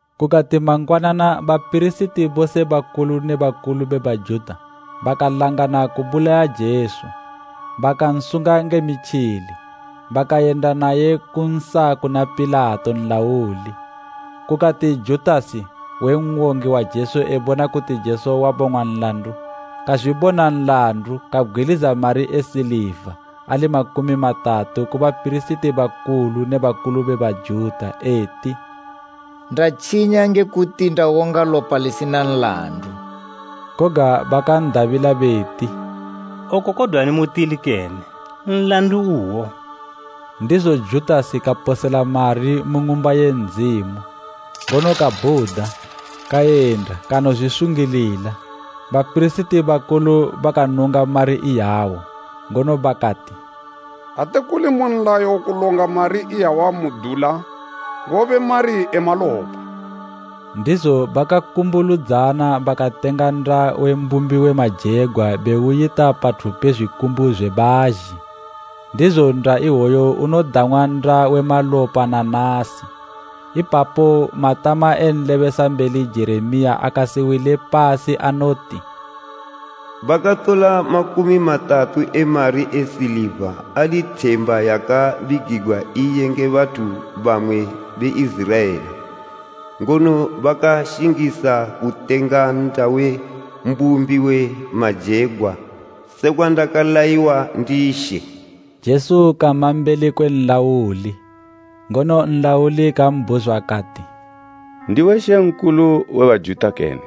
Kukati mangwanana bapirisiti bose bakulu ne bakulu be Bajuta bakalangana kubulaya Jesu. Bakansunga nge mitjili, bakayenda naye bakansa kuna Pilato nlauli. Kukati Judasi, we n'wongi wa Jesu ebona kuti Jesu wabong'wa nlandu, kazwibona nlandu kabgwiliza mari e siliva ali makumi matatu ku bapirisiti bakulu ne bakulu be Bajuta eti, “Ndatjinya nge kuti ndawonga lopa lisina nlandu.” Koga bakan'dabila beti, “Oko kodwani mutili kene. Nlandu uwo.” Ndizo Judasi kaposela mari mu Ng'umba ye Ndzimu, ngono kabhuda, kayenda kanozwisungilila. Bapirisiti bakulu bakanunga mari iyawo, ngono bakati, “Ate kuli mu nlayo kulonga mari iyawa mu dula, ngobe mari e malopa.” Ndizo bakakumbuludzana, bakatenga nnda we mbumbi we majegwa beuyita pathu pe zwikumbu zwe bazhi. Ndizo nnda iwoyo udang'wa Nnda we Malopa na nasi. Ipapo matama e nlebesambeli Jeremiya akasiwile pasi anoti, “Bakatola makumi matatu e mari e siliva ali themba yakabigigwa iye nge bathu bamwe be Iziraela, ngono bakaashingisa kutenga nnda we mbumbi we majegwa sekwa ndakalayiwa ndi She.” Jesu kama mbeli kwe nlauli, ngono nlauli kambhuzwa kati, “Ndiwe Mambo we Bajuta kene?”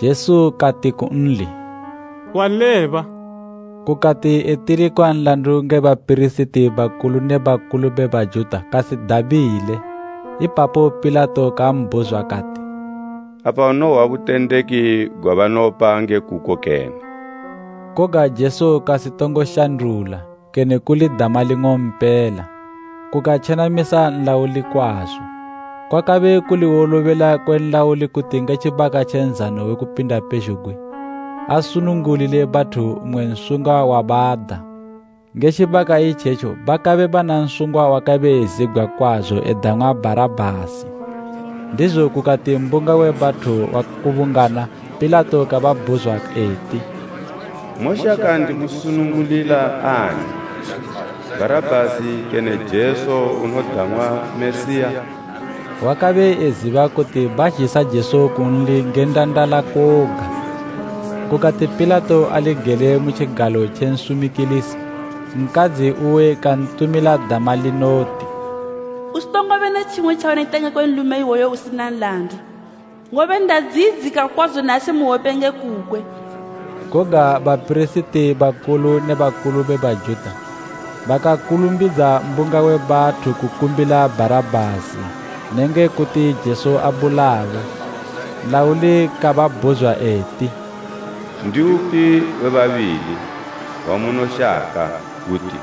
Jesu kati kunli, “Waleba.” Kukati etilikwa nlandu nge bapirisiti bakulu ne bakulu be Bajuta kasidabile. Ipapo Pilato kambhuzwa kati, “Apa unohwa butendeki gwabanopa nge kuko kene?” Koga Jesu kasitongo shandula, kene kuli dama ling'ompela; kukatjenamisa nlauli kwazo. Kwakabe kuli wolobela kwe nlauli kuti nge tjibaka tje Nzano we Kupinda pezhugwi, asunungulile bathu mmwe nsungwa wabada. Nge tjibaka itjetjo bakabe bana nsungwa wakabe ezibgwa kwazo edang'wa Bharabhasi. Ndizo kukati mbunga we bathu wakubungana, Pilato kababhuzwa eti, “Moshaka ndimusunungulila ani, Bharabhasi kene Jesu unodang'wa Mesiya?” Wakabe eziba kuti bazhisa Jesu kunli nge ndandala koga. Kukati Pilato ali gele mu tjigalo tje nsumikilisi, nkadzi uwe kantumila dama linoti, “Usitongobe ne tjimwe tjaunoyita ngekwe nlume iwoyu usina nlandu, ngobe ndadziyidzika kwazo nasi mu hwope nge kukwe.” Koga bapirisiti bakulu ne bakulu be Bajuta bakakulumbidza mbunga we bathu kukumbila Bharabhasi nenge kuti Jesu abulawe. Nlauli kababhuzwa eti, “Ndiupi we babili wamunoshaka kuti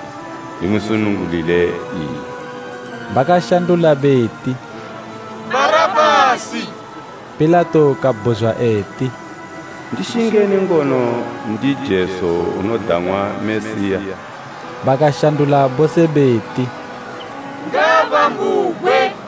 ndimusunungulile iye?” Bakashandula beti, “Bharabhasi.” Pilato kabhuzwa eti, “Ndishingeni ngono ndi Jesu unodang'wa Mesiya?” Bakashandula bose beti, “Ngaabambugwe!”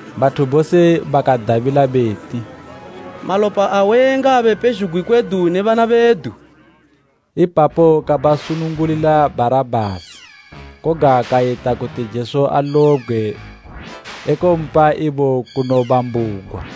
Bathu bose bakadabila beti, “Malopa awe ngaabe pezhugwi kwedu ne bana bedu!” Ipapo kabasunungulila Bharabhasi, koga kayita kuti Jesu alobgwe ekompa ibo kunobambugwa.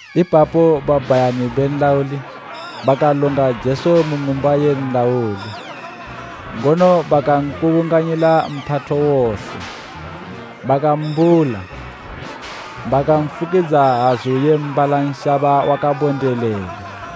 Ipapo babhayani be nlauli bakalonga Jesu mu ng'umba ye nlauli ngono bakankubunganyila mphatho wose. Bakambula bakanfukidza hazu ye mbala nshaba wakabondelela,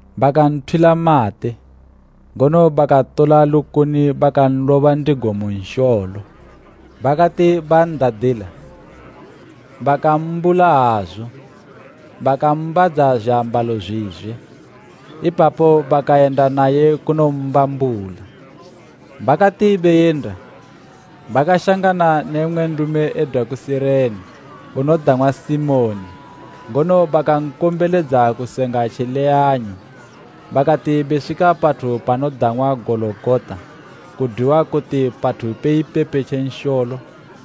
Bakanthwila mate, ngono bakatola lukuni bakanloba ndigo mu nsholo. Bakati ban'dadila, bakammbula hazu bakambadza zwiambalo zwizwe. Ipapo bakayenda naye kunommbambula. Bakati beyenda, bakashangana ne mmwe nlume edwa ku Sirene unodang'wa Simoni ngono bakankombeledza kusenga tjileyanyo. Bakati beswika pathu panodang'wa Gologota, kodwiwa kuti Pathu pe ipepe tje nsholo.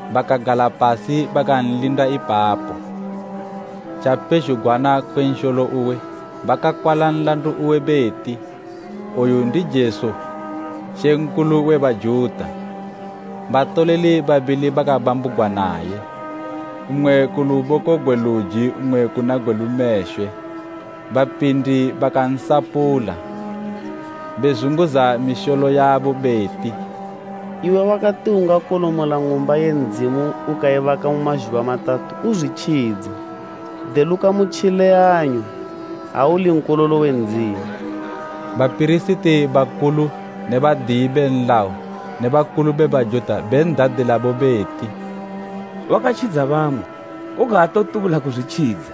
Bakagala pasi bakanlinda ipapo. Tjapezhugwana kwe nsholo uwe bakakwala nlandu uwe beti, “OYU NDI JESU, MAMBO WE BAJUTA.” Batoleli babili bakabambugwa naye, mmwe ku luboko gwe luji mmwe kuna gwe lumeshwe. Bapindi bakansapula, bezunguza misholo yabo beti, “Iwe wakati ungakolomola ng'umba ye Ndzimu ukaibaka mu mazhuba matatu, uzwitjidze! Deluka mu tjileyanyo, ha uli Nkololo we Ndzimu!” Bapirisiti bakulu ne badiyi be nlayo ne bakulu be Bajuta ben'dadilabo beti; “Wakatjidza bamwe, koga aatotubula kuzwitjidza!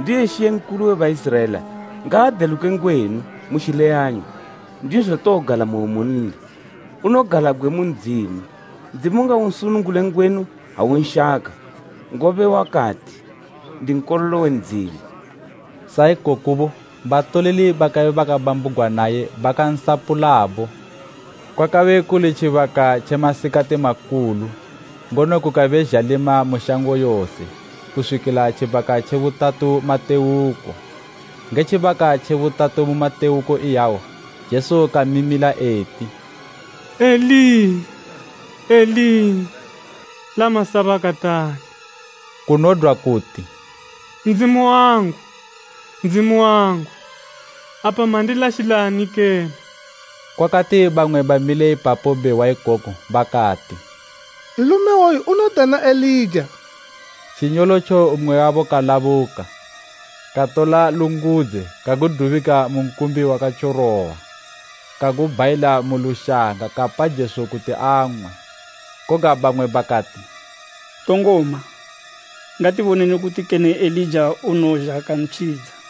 Ndiye mambo we Baiziraela, ngaadeluke ngwenu mu tjileyanyo, ndizo towogalamoyo munli. Unogalabgwe mu Ndzimu. Ndzimu ngaunsunungule ngwenu ha unshaka, ngobe wakati, ‘Ndi Nkololo we Ndzimu.’” Sa ikokobo batoleli bakabe babambugwa naye bakansapulabo. Kwakabe kuli tjibaka tje masikati makulu, ngono kukabe zhalima mu shango yose kuswikila tjibaka tje butatu matewuko. Nge tjibaka tje butatu mu matewuko iyawo Jesu kamimila eti, “Eli, Eli, lama sabakatani?” Kunodwa kuti, “Ndzimu wangu, Ndzimu wangu, apa mandilashilani kene?” Kukati bamwe bamile ipapo behwa ikoko bakati, “Nlume iwoyu unodana Elija.” Tjinyolotjo mmwe wabo kalabuka katola lungudze kagudubika mu nkumbi wakatyorowa kagubhayila mu lushanga kapa Jesu kuti ang'we. Koga bamwe bakati, “Tongoma, ngatiboneni kuti kene Elija unowozha kantjidza.”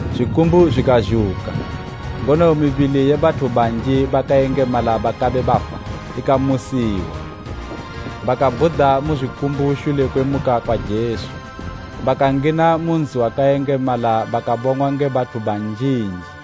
Zwikumbu zwikazhuka, ngono mibili ye bathu banji bakayengemala bakabe bafa ikamusiwa. Bakabhuda mu zwikumbu shule kwe kumuka kwa Jesu, bakangina mu nzi wakayengemala bakabong'wa nge bathu banjinji.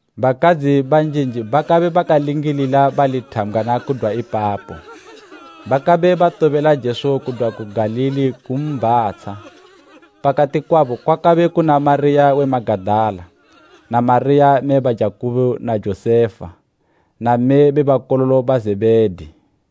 Bakadzi banjinji bakabe bakalingilila bali thambgwana kudwa ipapo. Bakabe batobela Jesu kudwa ku Galili kumbhatsha. Pakati kwabo kwakabe kuna Mariya we Magadala na Mariya mme ba Jakubo na Josefa, na mme be bakololo ba Zebhedi.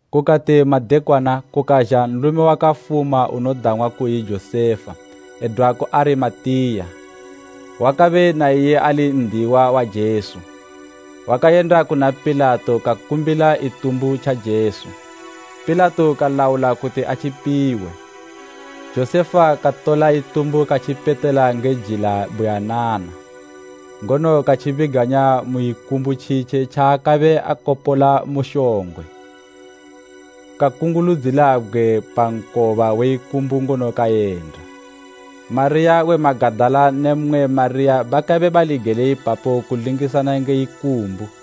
Kukati madekwana kukazha nlume wakafuma unodang'wa kuyi Josefa edwa ku Arimateya, wakabe na iye ali n'diyiwa wa Jesu. Wakayenda kuna Pilato kakumbila itumbu tja Jesu. Pilato kalaula kuti atjipiwe. Josefa katola itumbu katjipetela nge jila buyanana, ngono katjibiganya mu ikumbu tjitje tjaakabe akopola mu shongwe. Kakunguludzila bgwe pa nkoba we ikumbu ngono kayenda. Mariya we Magadala ne mmwe Mariya bakabe bali gele ipapo kulingisana nge ikumbu.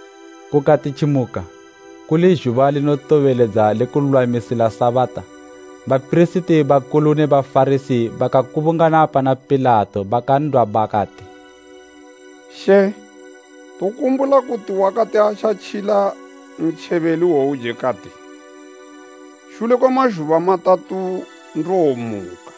Kukati tjimuka, kuli zhuba linotobeledza le kululwamisila Sabata, bapirisiti bakulu ne Bafarasi bakakubungana pana Pilato bakan'dwa bakati, “She, tokumbula kuti wakati atjatjila ntjebeli iwouje kati, ‘Shule kwe mazhuba matatu, ndowomuka.’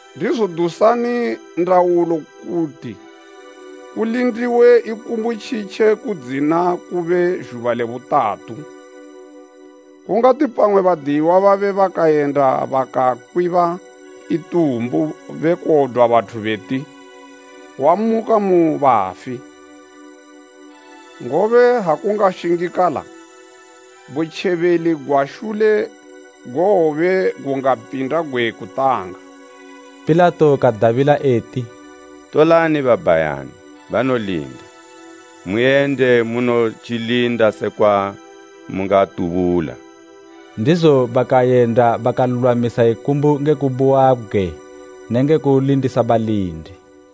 Ndizo dusani ndaulo kuti kulindiwe ikumbu tjitje kudzina kube zhuba le butatu. Kungati pamwe badiyiwa babe bakayenda bakakwiba itumbu bekodwa bathu beti ‘Wamuka mu bafi,’ ngobe ha kungashingikala, butjebeli gwa shule gowobe gungapinda gwe kutanga.” Pilato kadabila eti, “Tolani babhayani banolinda, muyende munotjilinda sekwa mungatubula.” Ndizo bakayenda bakanolulwamisa ikumbu nge kubuwa bgwe nenge kulindisa balindi.